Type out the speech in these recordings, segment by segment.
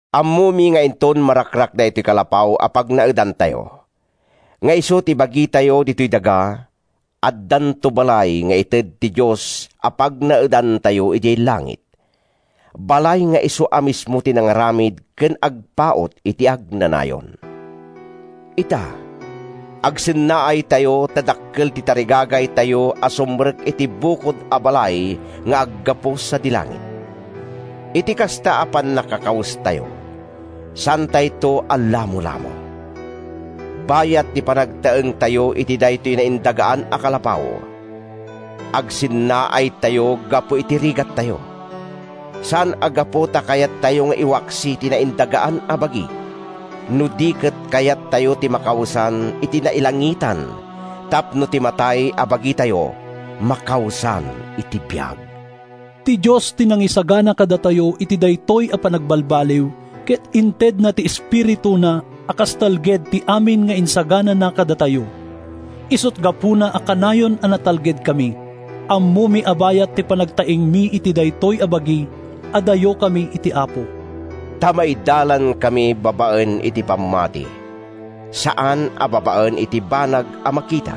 Ammomi nga inton marakrak daytoy kalapaw a pagnaedantayo, nga isu ti bagitayo ditoy daga, addanto balay nga ited ti Dios a pagnaedantayo idiay langit, balay nga isu a mismo ti nangaramid ken agpaut iti agnanayon. Ita, agsennaaytayo ta dakkel ti tarigagaytayo a sumrek iti bukod a balay nga aggapu sadi langit. Iti kasta a pannakakawestayo, saantayton a lamolamo. Bayat ti panagtaengtayo iti daytoy naindagaan a kalapaw, agsennaaytayo gapu iti rigattayo; saan a gapu ta kayattayo nga iwaksi ti naindagaan a bagi, no di ket kayattayo ti makawesan iti nailangitan tapno ti matay a bagitayo makawesan iti biag. Ti Dios ti nangisagana kadatayo iti daytoy a panagbalbaliw, ket intedna ti Espirituna a kas talged ti amin nga insaganana kadatayo. Isut’ gapuna a kanayon a natalgedkami. Ammomi a bayat ti panagtaengmi iti daytoy a bagi, adayokami iti Apo. Ta maidalankami babaen iti pammati, saan a babaen iti banag a makita.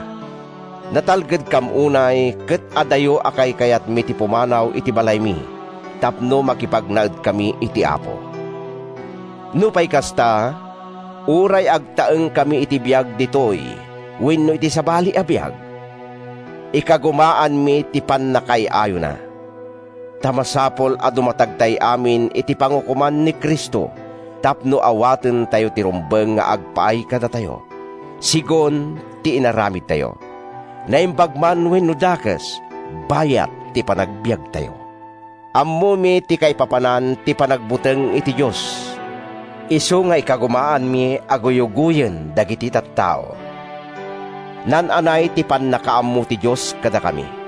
Natalgedkam unay ket adayo a kaykayatmi ti pumanaw iti balaymi tapno makipagnaedkami iti Apo. Nupay kasta, uray agtaengkami iti biag ditoy wenno iti sabali a biag, ikagumaanmi ti pannakaay-ayona. Ta masapul a dumatagtay amin iti pangukoman ni Cristo tapno awatentayo ti rumbeng nga agpaay kadatayo, segun ti inaramidtayo, naimbag man wenno dakes, bayat ti panagbiagtayo. Ammomi ti kaipapanan ti panagbuteng iti Dios, isu nga ikagumaanmi a guyugoyen dagiti tattao. Naan-anay ti pannakaammo ti Dios kadakami.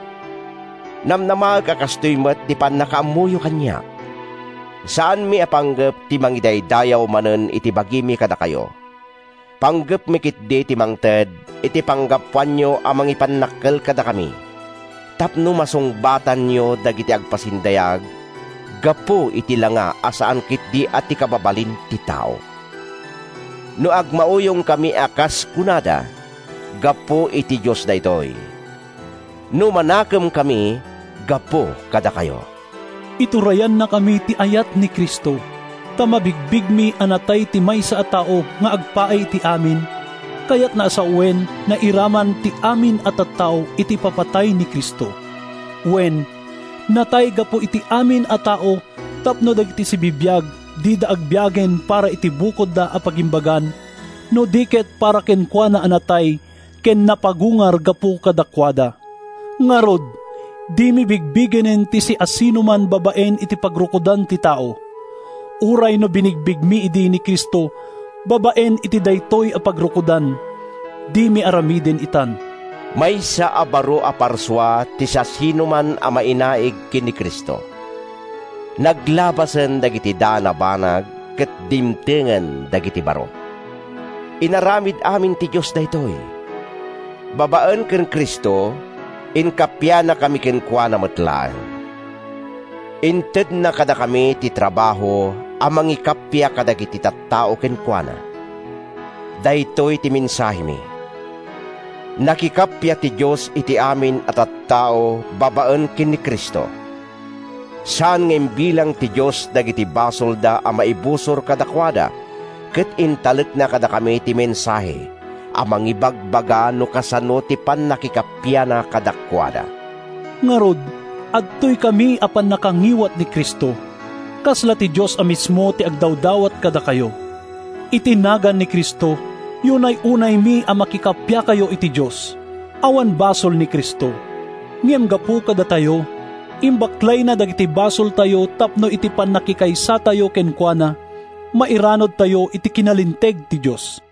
Namnamaek a kastoy met ti pannakaammoyo kaniak. Saanmi a panggep ti mangidaydayaw manen iti bagimi kadakayo. Panggepmi ketdi ti mangted iti panggapuanyo a mangipannakkel kadakami tapno masungbatanyo dagiti agpasindayag gapu iti langa a saan ketdi a ti kababalin ti tao. No agmauyongkami a kas kunada, gapu iti Dios daytoy; no manakemkami, gapu kadakayo. Iturayannakami ti ayat ni Cristo, ta mabigbigmi a natay ti maysa a tao nga agpaay iti amin, kayatna a sawen, nairaman ti amin a tattao iti ipapatay ni Cristo. Wen, natay gapu iti amin a tao tapno dagiti sibibiag dida agbiagen para iti bukodda a pagimbagan, no di ket para kenkuana a natay ken napagungar gapu kadakuada. Ngarud, dimi bigbigenen ti siasinoman babaen iti pagrukodan ti tao. Uray no binigbigmi idi ni Cristo babaen iti daytoy a pagrukodan, dimi aramiden itan. Maysa a baro a parsua ti siasinoman a mainaig ken ni Cristo. Naglabasen dagiti daan a banag ket dimtengen dagiti baro. Inaramid amin ti Dios daytoy. Babaen ken Cristo, inkappianakami kenkuana met laeng. Intedna kadakami ti trabaho a mangikappia kadagiti tattao kenkuana. Daytoy ti mensahemi: Nakikappia ti Dios iti amin a tattao babaen ken ni Cristo. Saan nga imbilang ti Dios dagiti basolda a maibusor kadakuada ket intalekna kadakami ti mensahe a mangibaga no kasano ti pannakikappiana kadakuada. Ngarud, adtoykami a pannakangiwat ni Cristo. Kasla ti Dios a mismo ti agdawdawat kadakayo. Iti nagan ni Cristo, yunay-unaymi a makikappiakayo iti Dios! Awan basol ni Cristo. Ngem gapu kadatayo, imbaklayna dagiti basoltayo tapno iti pannakikaysatayo kenkuana, mairanudtayo iti kinalinteg ti Dios.